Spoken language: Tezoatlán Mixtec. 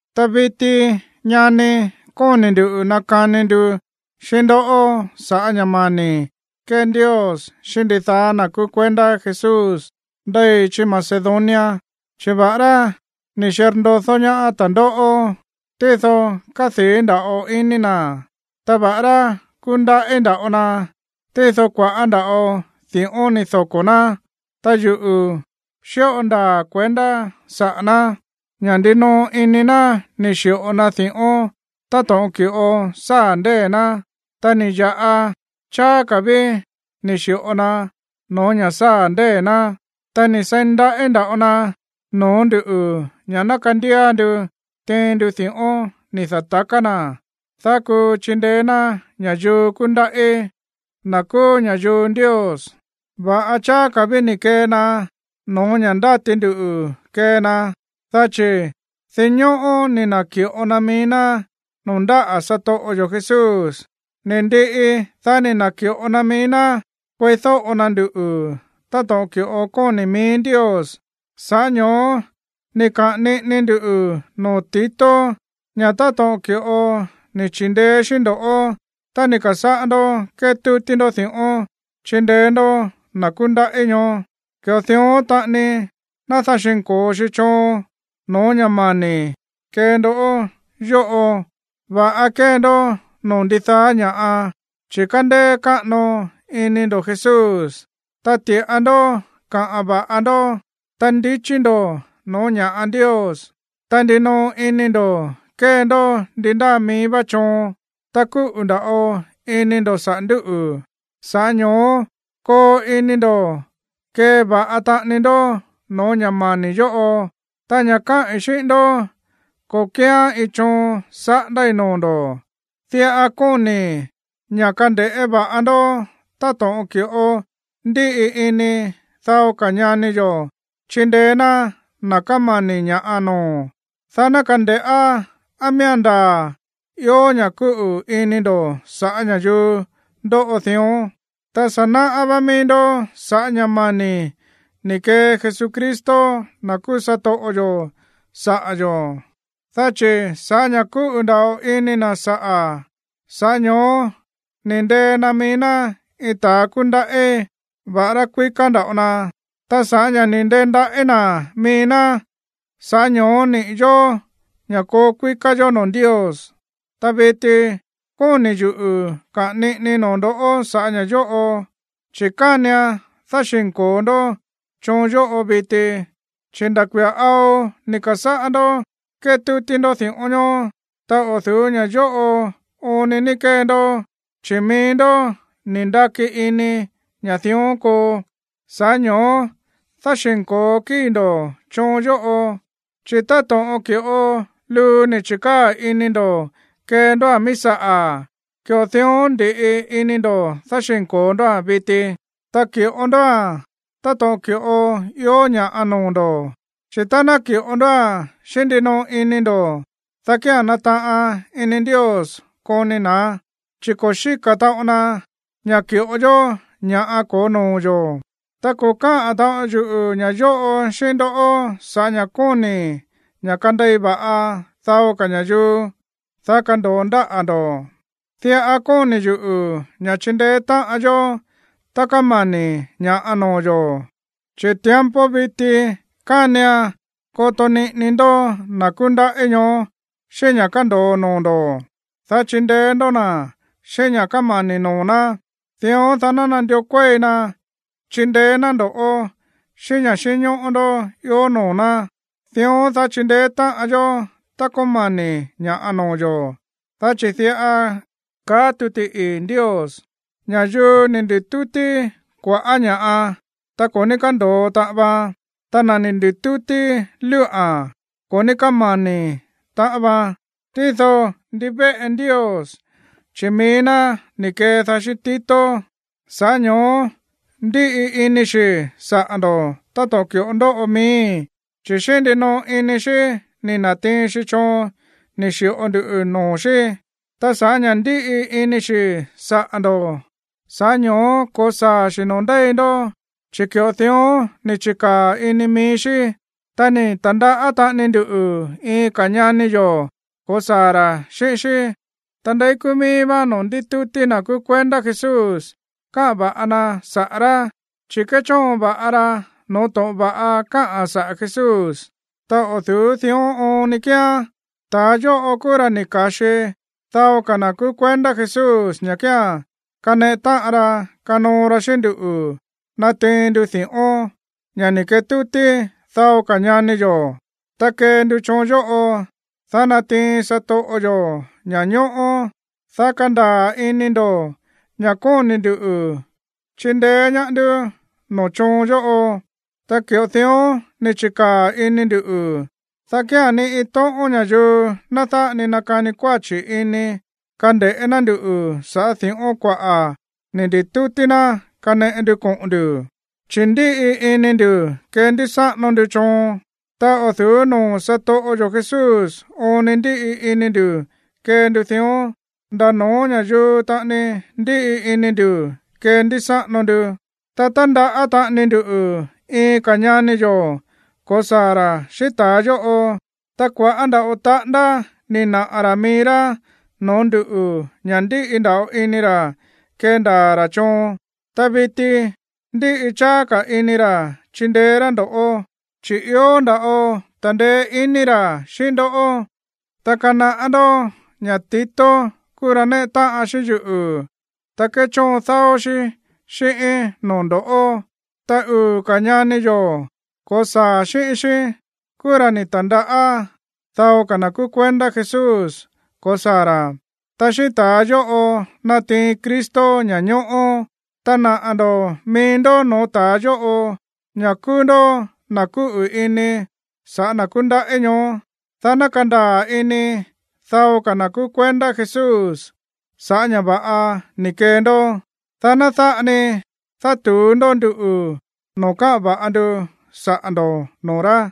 Ta viti, ñani, kóni̱ ndu̱ nakani ndu xíꞌín ndó sa̱ꞌá ña̱ mani̱ kée Ndios xíꞌín ndidaá na̱ kúú kuendá Jesús ndéi chí Macedonia. Chi̱ va̱ꞌará ni̱ xirndodó ñaá ta̱ndóꞌó, tído kádii̱ nda̱ꞌo ini na̱, ta va̱ꞌará kúndaꞌí nda̱ꞌo na, tído kua̱ꞌá nda̱ꞌo di̱ꞌón ni̱ doko̱ ná. Ta yuꞌu̱ xíꞌo ndaa̱ kuendá saꞌa̱ ná, ña̱ ndinoꞌo ini ná ni̱ xi̱ꞌo na di̱ꞌón táto̱ꞌon ki̱ꞌo sáa̱ ndée̱ ná, ta ni̱ ya̱ꞌa cháá ka̱ ví ni̱ xi̱ꞌo na no̱ó ña̱ sáa̱ ndée̱ ná. Ta ni̱ seí ndaꞌí nda̱ꞌo na no̱ó nduꞌu̱ ña̱ ná kandía ndu tiin ndu di̱ꞌón ni̱ da̱taká na̱, dá kuu chindeé ná ña̱yuu kúndaꞌí, na̱ kúú ña̱yuu Ndios. Va̱ꞌa cháá ka̱ ví ni̱ kee na no̱ó ña̱ ndáti ndu kee na, dá chi̱ dinñóꞌó ni̱ na̱ki̱ꞌo na mií ná noo̱ ndáꞌa̱ satoꞌo yo̱ Jesús. Ni̱ ndiꞌi, dá ni̱ na̱ki̱ꞌo na mií ná kueídóꞌo na nduꞌu̱ táto̱ꞌon ki̱ꞌo kóni̱ mií Ndios. Sa̱ꞌá ño̱ó ni̱ kaꞌa̱n niꞌini ndu noo̱ Tito ña̱ táto̱ꞌon ki̱ꞌo ni̱ chi̱ndeé xí ndo̱ꞌó tá ni̱ ka̱sáꞌá ndó kétútí ndó di̱ꞌón chindeé ndó na̱ kúndaꞌí ñoó, ki̱ꞌo dión taꞌani ná dáxi̱nko̱o xi choon no̱ó ña̱ mani̱ kee ndó yóꞌo. Va̱ꞌa kée ndó noo̱ ndidaá ña̱ꞌa, chi̱ kándéé káꞌano iní ndo̱ Jesús, ta ti̱ꞌa ndó kaꞌa̱n va̱ꞌa ndó, ta ndichí ndo̱ no̱ó ña̱ꞌa Ndios, ta ndinoꞌo ini ndo̱ kée ndó ndi ndáa mií vá choon, ta kúꞌu̱ nda̱ꞌo ini ndo̱ saꞌa̱ ndú. Sa̱ꞌá ño̱ó koo ini ndo̱ kee va̱ꞌa taꞌani ndó no̱ó ña̱ mani̱ yóꞌo. Ta ña̱ káꞌi̱n xíꞌín ndó, ko̱ kíán iin choon saꞌándái̱ noo̱ ndo̱. Diꞌa kóni̱i̱ ña̱ kande̱ꞌé va̱ꞌa ndó táto̱ꞌon ki̱ꞌo ndíꞌi ini dao ka̱ ñani yo̱ chindeé ná na̱ kámani̱ ña̱ꞌa noo̱, dá ná kande̱ꞌá á miía̱n ndaa̱ ió ña̱ kúꞌu̱ ini ndo̱ sa̱ꞌá ña̱yuu ndóꞌo dión. Ta sa̱ naꞌá vá mií ndó sa̱ꞌá ña̱ mani̱ ni̱ kee Jesucristo, na̱ kúú satoꞌo yo̱, saꞌa̱ yo̱, dá chi̱ sa̱ꞌá ña̱ kúꞌu̱ nda̱ꞌo ini na̱ saꞌa̱, sa̱ꞌá ño̱ó ni̱ ndee na mií ná iin ta̱a kúndaꞌí, va̱ꞌará kuíká nda̱ꞌo na. Ta sa̱ꞌá ña̱ ni̱ ndendaꞌí na̱ mií ná, sa̱ꞌá ño̱ó niꞌi̱ yo̱ ña̱ koo kuíká yó noo̱ Ndios. Ta viti kóni̱ yuꞌu̱ kaꞌa̱n niꞌinii noo̱ ndo̱ sa̱ꞌá ña̱ yóꞌo. Chi̱ kánian dáxi̱nko̱o ndó choon yóꞌo viti, chi̱ nda̱ kuia̱ ao ni̱ ka̱sáꞌá ndó kétútí ndó di̱ꞌón ñoó, ta o̱ du̱ú ña̱ yóꞌo oon ni ní kee ndó, chi̱ mií ndó ni̱ ndaki ini ña̱ dión koo. Sa̱ꞌá ño̱ó dáxi̱nko̱o kíi̱ ndo̱ choon yóꞌo, chi̱ táto̱ꞌon ki̱ꞌo luu ni̱ chi̱kaa̱ ini ndo̱ kee ndóa̱n mií saꞌa̱, ki̱ꞌo dión ndi̱ꞌi ini ndo̱ dáxi̱nko̱o ndóa̱n viti. Ta ki̱ꞌo ndóa̱n táto̱ꞌon ki̱ꞌo ió ña̱ noo̱ ndo̱. Chi̱ tá ná ki̱ꞌo ndóa̱n xíꞌín ndinoꞌo ini ndo̱, dá kía̱n nataꞌan ini Ndios koni na̱án, chi̱ ko̱ xíka̱ taꞌon na ña̱ ki̱ꞌo yó ña̱ ko̱ó noo̱ yo̱. Ta ko̱ káꞌa̱n taꞌon yuꞌu̱ ña̱ yóꞌo xíꞌín ndó sa̱ꞌá ña̱ kóni̱i̱ ña̱ kandei va̱ꞌa dao ka̱ ña̱yuu, dá kando̱o ndáꞌa̱ ndo̱. Diꞌa kóni̱ yuꞌu̱ ña̱ chindeé táꞌan yó tá kamani̱ ña̱ꞌa noo̱ yo̱, chi̱ tiempo viti kánian koto niꞌini ndó na̱ kúndaꞌí ñoó xíꞌín ña̱ kándo̱o noo̱ ndo̱, dá chindeé ndó na̱ xíꞌín ña̱ kámani̱ noo̱ ná. Dión, dá ná nandió kuéi na chindeé ná ndo̱ꞌó xíꞌín ña̱ xínñóꞌó ndó ió noo̱ ná, dión, dá chindeé táꞌan yó tá kámani̱ ña̱ꞌa noo̱ yo̱. Dá chi̱ diꞌa kaá tuti ii̱ Ndios: “Ña̱yuu ni̱ ndi̱tútí kua̱ꞌá ña̱ꞌa, ta ko̱ ní kándo̱o taꞌan vaan. Ta na̱ ni̱ ndi̱tútí lúꞌa̱n, ko̱ ní kámani̱ taꞌan vaan.” Tído ndivéꞌe Ndios, chi̱ mií ná ni̱ kedaá xíꞌín Tito, sa̱ꞌá ño̱ó ndíꞌi ini xi̱ saꞌa̱ ndo̱ táto̱ꞌon ki̱ꞌo ndóꞌo miíi̱. Chi̱ xíꞌín ndinoꞌo ini xí ni̱ na̱tiin xi choon ni̱ xi̱ꞌo ndu noo̱ xí. Ta sa̱ꞌá ña̱ ndíꞌi ini xi̱ saꞌa̱ ndo̱, sa̱ꞌá ño̱ó ko̱saa̱ xi̱ noo̱ ndéi ndó, chi̱ ki̱ꞌo dión ni̱ chi̱kaa̱ ini mií xí. Ta ni̱ ta̱ndaꞌá taꞌani ndu iin ka̱ ñani yo̱ ko̱saa̱ ra̱ xíꞌín xí, ta ndeí kúú míí vá noo̱ ndítútí na̱ kúú kuendá Jesús káꞌa̱n va̱ꞌa na saꞌa̱ rá, chi̱ kéchóon va̱ꞌa ra no̱ó to̱ꞌon va̱ꞌa káꞌa̱n saꞌa̱ Jesús. Ta o̱ du̱ú dión oon ni kíán, ta̱a yóꞌo kúú ra̱ ni̱ ka̱xi dao ka̱ na̱ kúú kuendá Jesús ña̱ kía̱n kaneꞌe táꞌan ra kanoo ra xíꞌín nduꞌu̱ natiin ndu di̱ꞌón, ña̱ ni̱ ketútí dao ka̱ ñani yo̱. Ta kee ndu choon yóꞌo, dá ná natiin satoꞌo yo̱ ña̱ñóꞌó, dá kandaa̱ ini ndo̱ ña̱ kóni̱ ndu̱ chindeé ñaá ndú noo̱ choon yóꞌo. Ta ki̱ꞌo dión ni̱ chi̱kaa̱ ini ndu̱, dá kía̱n ni iin tóꞌón ña̱yuu ná dáꞌa ni nakani kuáchi̱ ini kande̱ꞌé ná ndu̱ sa̱ꞌá di̱ꞌón kuaꞌa̱ ni̱ ndi̱tútí ná kaneꞌe ndu koꞌo̱n ndu̱. Chi̱ ndíꞌi ini ndu̱ kéndísáꞌano ndu choon. Ta o̱ du̱ú noo̱ satoꞌo yo̱ Jesús oon ni ndíꞌi ini ndu̱ kee ndu dión, nda̱ no̱ó ña̱yuu taꞌani ndíꞌi ini ndu̱ kéndísáꞌano ndu. Ta tándaꞌá taꞌani ndu iin ka̱ ñani yo̱ ko̱saa̱ ra̱ xíꞌín ta̱a yóꞌo. Ta kua̱ꞌá nda̱ꞌo taꞌándá ni̱ naꞌa̱ ra̱ mií rá noo̱ ndú ña̱ ndíꞌi nda̱ꞌo ini ra̱ kendaa̱ ra̱ choon. Ta viti ndíꞌi cháá ka̱ ini ra̱ chindeé rá ndo̱ꞌó, chi̱ ió nda̱ꞌo ta̱ndeé iní ra̱ xíꞌín ndó. Ta kanaꞌá ndó ña̱ Tito kúú ra̱ néꞌe táꞌan xíꞌín yuꞌu̱, ta kéchóon dáó xí xíꞌíín noo̱ ndo̱ꞌó. Ta uu̱ ka̱ ñani yo̱ ko̱saa̱ xíꞌín xí kúú ra̱ ni̱ ta̱ndaꞌá dao ka̱ na̱ kúú kuendá Jesús ko̱saa̱ ra̱, ta xíꞌín ta̱a yóꞌo natiin Cristo ña̱ñóꞌó. Ta naꞌa̱ ndo̱ mií ndó no̱ó ta̱a yóꞌo ña̱ kúú ndó na̱ kúꞌu̱ ini saꞌa̱ na̱ kúndaꞌí ñoó, dá ná kandaa̱ ini dao ka̱ na̱ kúú kuendá Jesús sa̱ꞌá ña̱ va̱ꞌa ni̱ kee ndó, dá ná dáꞌa ni dátu̱ú ndó nduꞌu̱ no̱ó káꞌa̱n va̱ꞌa ndu saꞌa̱ ndo̱ noo̱ rá.